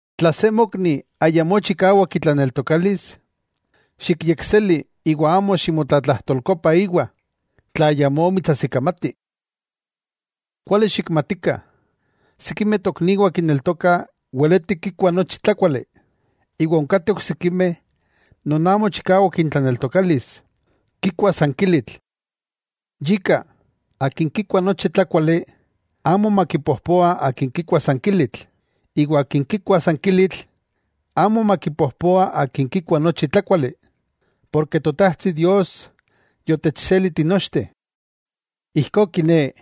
Tla se mokni ayamó chikawak itlaneltokalis, xikyekseli iwa amo ximotlatlajtolkopa íwa, tla ayamó mitsajsikamati. Kuali xikmatikah, sikimeh tokniwah kineltokah weleti kikuah nochi tlákuali, iwa onkateh oksikimeh non amo chikawak intlaneltokalis, kikuah san kilitl. Yika, akin kikua nochi tlákuali, amo makipojpoa akin kikua san kilitl, iwa akin kikua san kilitl, amo makipojpoa akin kikua nochi tlákuali, porke Totajtsi Dios yotechseli tinochteh. Ijkó kiné,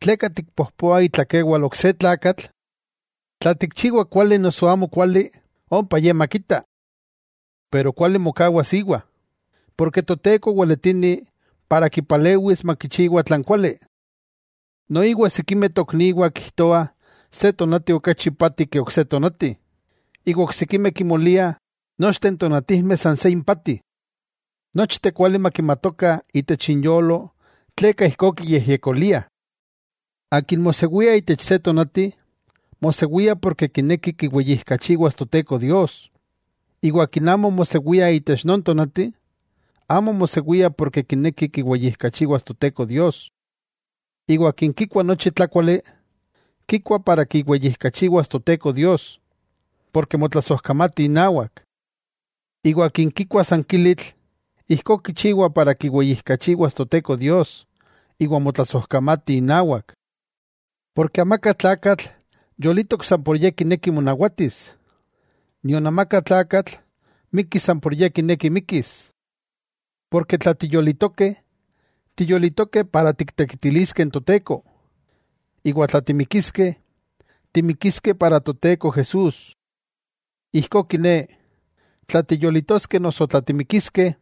¿tleka tikpojpoa itlakewal ok se tlakatl? Tla kichiwa kuali noso amokuali, ompa ye makita. Pero kuali mokawas íwa, porke Toteko Weletini para kipalewis makichiwa tlan kuali. Noiwa sikimeh tokniwah kijtoah se tonati okachi ipati ke ok se tonati, iwa oksikimeh kimoliah nochteh n tonatijmeh san se impati. Nochteh kuali makimatokah itech inyolo tleka ijkó kiyejyekoliah. Akin mosewia itech se tonati, mosewia porke kineki kiweyijkachiwas Toteko Dios. Iwa akin amo mosewia itech non tonati, amo mosewia porke kineki kiwejkachiwas Toteko Dios. Iwa akin kikua nochi tlákuali, kikua para kiweyijkachiwas Toteko Dios, porke motlasojkamati inawak. Iwa akin kikua san kilitl, ijkó kichiwa para kiweyijkachiwas Toteko Dios, iwa motlasojkamati inawak. Porke amaka tlakatl yolitok san por ye kineki monawatis, nion amaka tlakatl mikki san por ye kineki mikkis. Porke tla tiyolitokeh, tiyolitokeh para tiktekitiliskeh n Toteko; iwa tla timikiskeh, timikiskeh para Toteko Jesús. Ijkó kiné, tla tiyolitoskeh noso tla timikiskeh,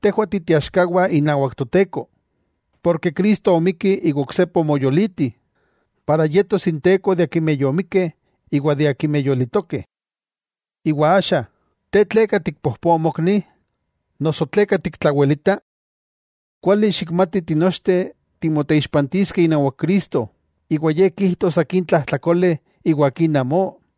tejwah ti teaxkawah inawak Toteko. Porke Cristo omikki iwa oksepa omoyoliti, para yetos Inteko de akimeh yomikkeh iwa de akimeh yolitokeh. Iwa axa, ¿te, tleka tikpojpoa mokni? Noso ¿tleka tiktlawelita? Kuali xikmati tinochteh timoteixpantiskeh inawak Cristo iwa Ye kijtos akin tlajtlakole iwa akin amó.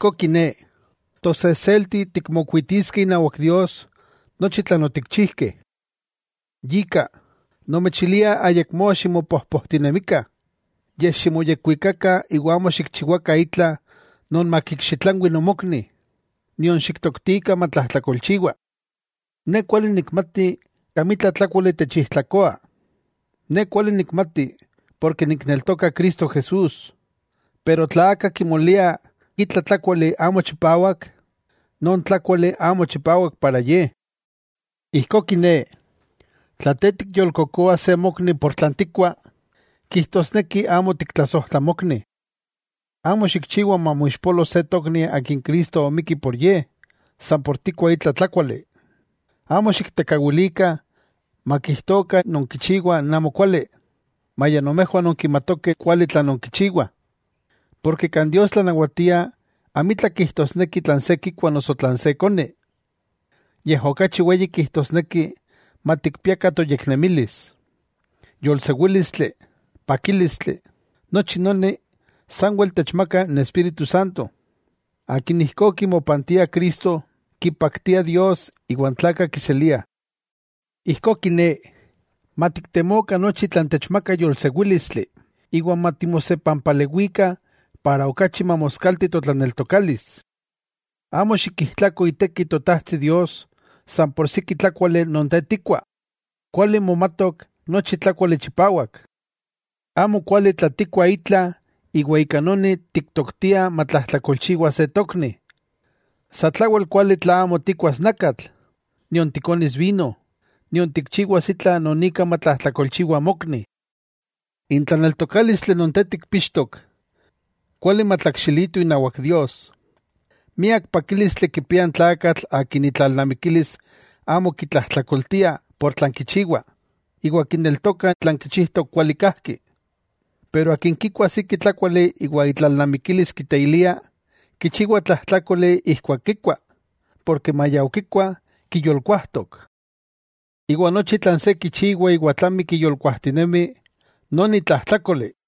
Ijkó kiné, tosejselti tikmokuitiskeh inawak Dios nochi tlan otikchijkeh. Yika, nomechilia ayakmó ximopojpojtinemikah. Yej ximoyekwikakah iwa amo xikchiwakah itla non makikxitlanwi nomokni, nion xiktoktikah matlajtlakolchiwa. Ne kuali nikmati amitla tlákuali techijtlakoa, ne kuali nikmati porke nikneltoka Cristo Jesús, pero tla aka kimolia itla tlákuali amo chipawak, non tlákuali amo chipawak para ye. Ijkó kiné, tla te tikyolkokoa se mokni por tlan tikkua, kijtosneki amo tiktlasojtla mokni. Amo xikchiwa mamoixpolo se tokni akin Cristo omikki por ye, san por tikkua itla tlákuali. Amo xiktekawilikah, makijtokah nonkichiwah n amokuali, maya nomejwah nonkimatokeh kuali tlan nonkichiwah. Porke kan Dios tlanawatia amitla kijtosneki tlan se kikua noso tlan se koni, yej okachi weyi kijtosneki matikpiakah toyeknemilis, yolsewílistli, pakílistli, nochi noni sanwel techmaka n Espíritu Santo. Akin ijkó kimopantia Cristo, kipaktia Dios iwa n tlakah kiseliah. Ijkó kiné, matiktemokah nochi tlan techmaka yolsewílistli, iwa matimosepampalewikah para okachi mamoskalti totlaneltokalis. Amo xikijtlako iteki n Totajtsi Dios san por siki tlákuali non te tikua. Kuali momatok nochi tlákuali chipawak. Amokuali tla tikkuah itla iwa ika noni tiktoktiah matlajtlakolchiwa se tokni. Satlawel kuali tla amo tikkuas nakatl, nion tikonis vino, nion tikchiwas itla non ika matlajtlakolchiwa mokni. N tlaneltokálistli non te tikpíxtok, kuali matlakxilito inawak Dios. ¡Miak pakílistli kipia n tlakatl akin itlalnamikilis amo kitlajtlakoltia por tlan kichiwa, iwa kineltoka tlan kichijtok kuali kajki! Pero akin kikua siki tlákuali iwa itlalnamikilis kiteilia, kichiwa tlajtlákoli ijkuak kikua, porke maya okikua, kiyolkuajtok. Iwa nochi tlan se kichiwa iwa tlami kiyolkuajtinemi, noni tlajtlákoli.